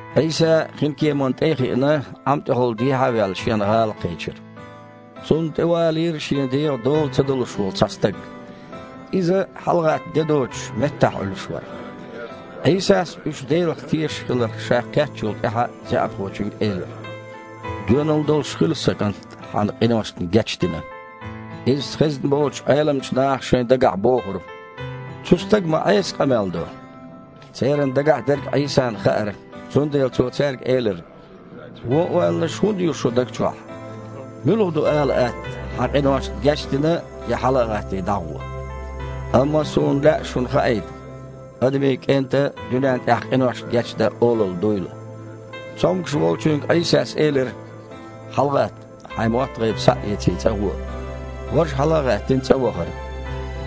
Іийса, хинкеманна тІе а хиъна, Іам тІехула дехьа а ваьлла, Шен гІала кхечира. Цунна тІе валийра шен дегІан дола ца далуш волу цхьа стаг. Иза, хьалагІатта де доцуш, меттахь Іуьллуш вара. Іийсас, уьш Делах тешаш хиларх Ша кхеттачул тІаьхьа, заьІапхочуьнга элира: «Доьналла долуш хила, сан кІант, хьан къиношна гечдина». Иза хезна болчу Іеламчу наха шайн дагахь бохура: «Цу стага ма Іеса къамел до!» Церан дагахь дерг Іийсана хаьара. Цундела Цо цаьрга элира: «Вон ойланаш хІунда ю шун даг чохь? Муьлха ду ала атта: „Хьан къиношна гечдина“ я: „Хьала а гІаттий, дІагІо“? Амма Суна лаьа шуна хаийта Адамийн КІентан дуьнен тІехь къиношна гечдан олалла дуйла». Цомгуш волчуьнга Іийсас элира: «ХьалагІатта, хьайн мотт-гІайба схьа а эций, цІа гІуо». Важа, хьала а гІаьттина, цІа вахара.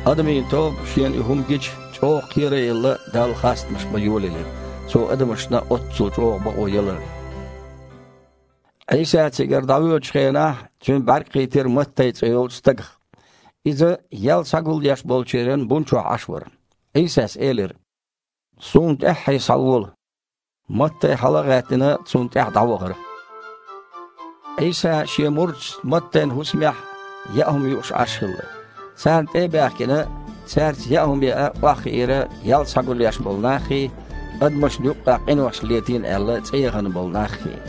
Адамийн тоба, шена и хІума гича, чІогІа кхера а елла, Далла хастамаш бан йолаелира, Цо адамашна оццул чІогІа бакъо яларна. Іийса цигара дІавоьдучу хенахь Цуьнан бІаьрг кхийтира Маттай цІе йолчу стагах. Иза ял схьагулъеш болчеран бун чохь Іаш вара. Іийсас элира: «Суна тІаьххье схьавола!» Маттай, хьала а гІаьттина, Цунна тІаьхьа дІавахара. Іийса Шен мурдашца Маттайн хІусамехь яа хІума юуш Іаш хилла. Царна тІе а баьхкина, цаьрца яа хІума яа охьахиира ял схьагулъеш болу наххий, адамашна юккъехь къинош летийна аьлла, цІе яхана болу наххий.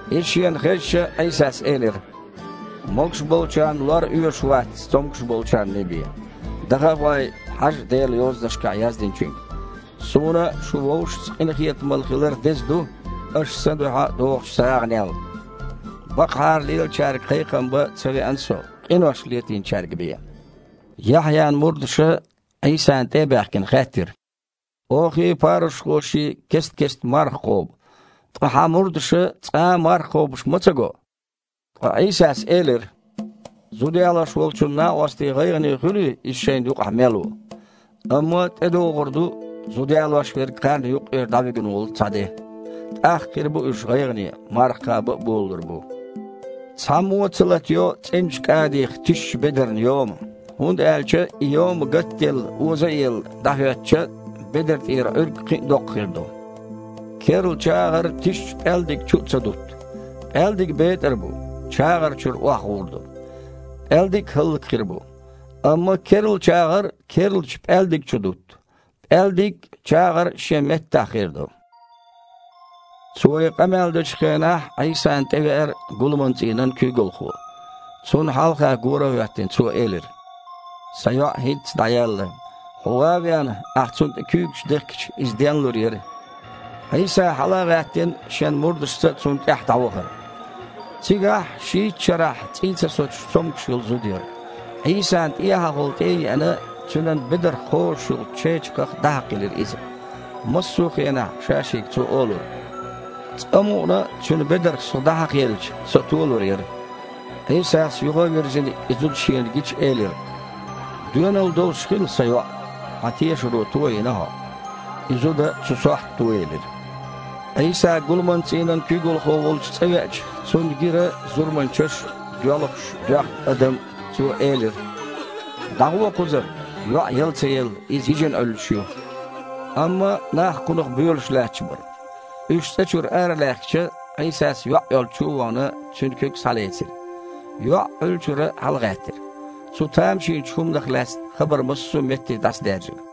Иза Шена хезча, Іийсас элира: «Могуш болчарна лор оьшуш вац, цомгуш болчарний бен. Даха а гІой, хьажа Делан Йозанашкахь яздинчуьнга: „Суна шун вовшашца къинхетамалла хилар деза ду, аша Сан дуьхьа дохучу сагІанел“. Бакъахьара лелачаьрга кхайкхам бан ца веана Со, къинош летийначаьрга бен». Яхьъян мурдаша, Іийсана тІе а баьхкина, хаьттира: «Охий, парушхоший кест-кестта марха кхобу, ткъа Хьан мурдаша цкъа а марха кхобуш ма ца го?!» Ткъа Іийсас элира: «Зуда ялош волчун накъостий гІайгІане хуьлий, иза шайна юкъахь мел ву? Амма тІедогІур ду зуда ялош верг кхарна юккъера дІавуьгун волу цхьа де. ТІаккха хир бу уьш гІайгІане, марха кхаба а болалур бу. Цхьаммо а ца латайо цІеначу кІадих тишачу бедарна йома, хІунда аьлча и йома гатъелла, оза а елла, дІахІоьттича, бедар тІера Іуьрг кхин а доккха хир ду. Керла чагІар тишачу пІаьлдиг чу а ца дутту. ПІаьлдиг бетІар бу, чагІар чуьра охьагІур ду. ПІаьлдиг а хІаллакьхир бу. Амма керла чагІар керлачу пІаьлдиг чу дутту: пІаьлдиг а, чагІар а шен меттехь хир ду». Цо и къамел дечу хенахь Іийсана тІевеара гуламан цІийнан куьйгалхо. Цунна хьалха гора а хІоьттина, цо элира: «Сан йоІ хІинцца дІаяьлла. Хьо ван а веана, Ахьа цунна тІе куьйгаш дехкича, иза денлур яра». Іийса, хьала а гІаьттина, Шен мурдашца цунна тІаьхьа дІавахара. Цигахь, шийтта шарахь цІий ца соцуш, цомгуш йолу зуда яра. Іийсана тІехьахула тІе а еана, Цуьнан бедарх кхозуш йолчу чечакхах дІахьакхаелира иза. Массо а хенахь ша-шега цо олура: «Цкъа мукъана а Цуьнан бедарх со дІахьакхаелча, со толур яра». Іийсас, юха а вирзина, и зуда Шена гича, элира: «Доьналла долуш хила, Сан йоІ! Хьан тешаро тойина хьо!» И зуда цу сохьта тоелира. Іийса гуламан цІийнан куьйгалхо волчу цІа веача, Цунна гира зурманчаш а, доьлхуш, доьхна адам а. Цо элира: «ДІагІо кхузара! ЙоІ яла ца елла, иза йижина Іуьллуш ю!» Амма нах Кхунах боьлуш лаьтташ бара. Уьш цІа чуьра аралаьхкича, Іийсас, йоІ йолчу чу а вахана, цуьнан куьг схьалецира. ЙоІ Іуьллучуьра хьалагІаьттира. Цу тамашийначу хІуманах лаьцна хабар массо а метте дІасадаьржира.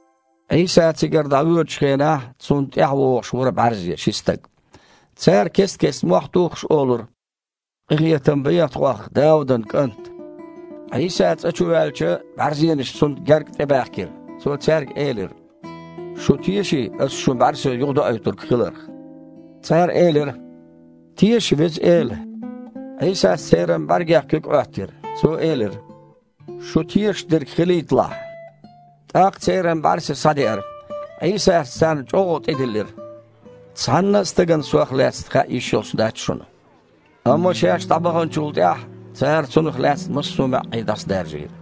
Іийса цигара дІавоьдучу хенахь Цунна тІаьхьавогІуш вара бІаьрзе ши стаг. Цара, кест-кеста мохь тухуш, олура: «Къинхетам бехьа тхох, Даудан КІант!» Іийса цІа чу ваьлча, бІаьрзенаш Цунна гергга тІебаьхкира. Цо цаьрга элира: «Шу теший Аса шун бІаьрса юхадоуьйтург хиларх?» Цара элира: «Теша, Веза Эла!» Іийсас церан бІаьргех куьг Іоьттира. Цо элира: «Шу тешаш дерг хилийталахь!» ТІаккха церан бІаьрса схьадеара. Іийсас царна чІоггІа тІедиллира: «Цхьанна а стагана Сох лаьцна хаа йиш йолуш дац шуна». Амма шаьш дІабаханчул тІаьхьа, цара Цунах лаьцна массо а маьІІе дІасадаржийра.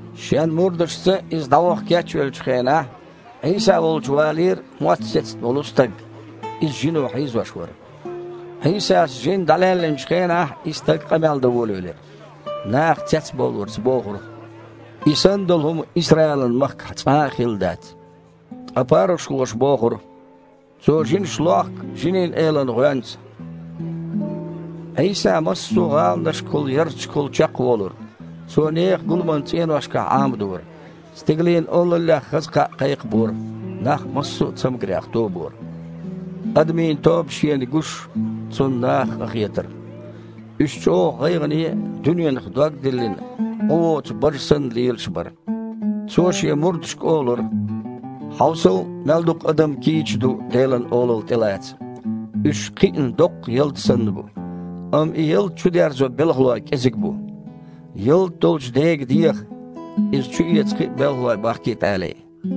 Шен мурдашца Иза дІаваха кечвеллачу хенахь Іийса волчу валийра мотт сецна волу стаг. Иза жино хьийзош вара. Іийсас жин дІалаьллиначу хенахь и стаг къамел дан волавелира. Наха цецбовларца бохура: «И санна долу хІума Исраилан махкахь цкъа а хилла дац». Ткъа парушхоша бохура: «Цо жинаш лохку жинийн элан гІоьнца». Іийса массо а гІаланашкахула, ярташкахула чекхволура. Цо нехан гуламан цІеношкахь Іамадора, Стигалийн Олаллех хаза кхаъ кхайкхабора, нах массо а цамгарех тобора. Адамийн тоба Шена гуш, Цунна нахах къахетара. Уьш чІогІа гІайгІане а, дуьненах дог диллина, Іу воцу бажа санна, лелаш бара. Цо Шен мурдашка олура: «Хьовсал, мел дукха адам кийча ду Делан Олалла тІелаца. Уьш кхиъна доккха ялта санна бу, амма и ялта чудерзо белхалой кІезиг бу. Ялта долчу Дега деха, иза чуэца кхин а белхалой бахкийта алий».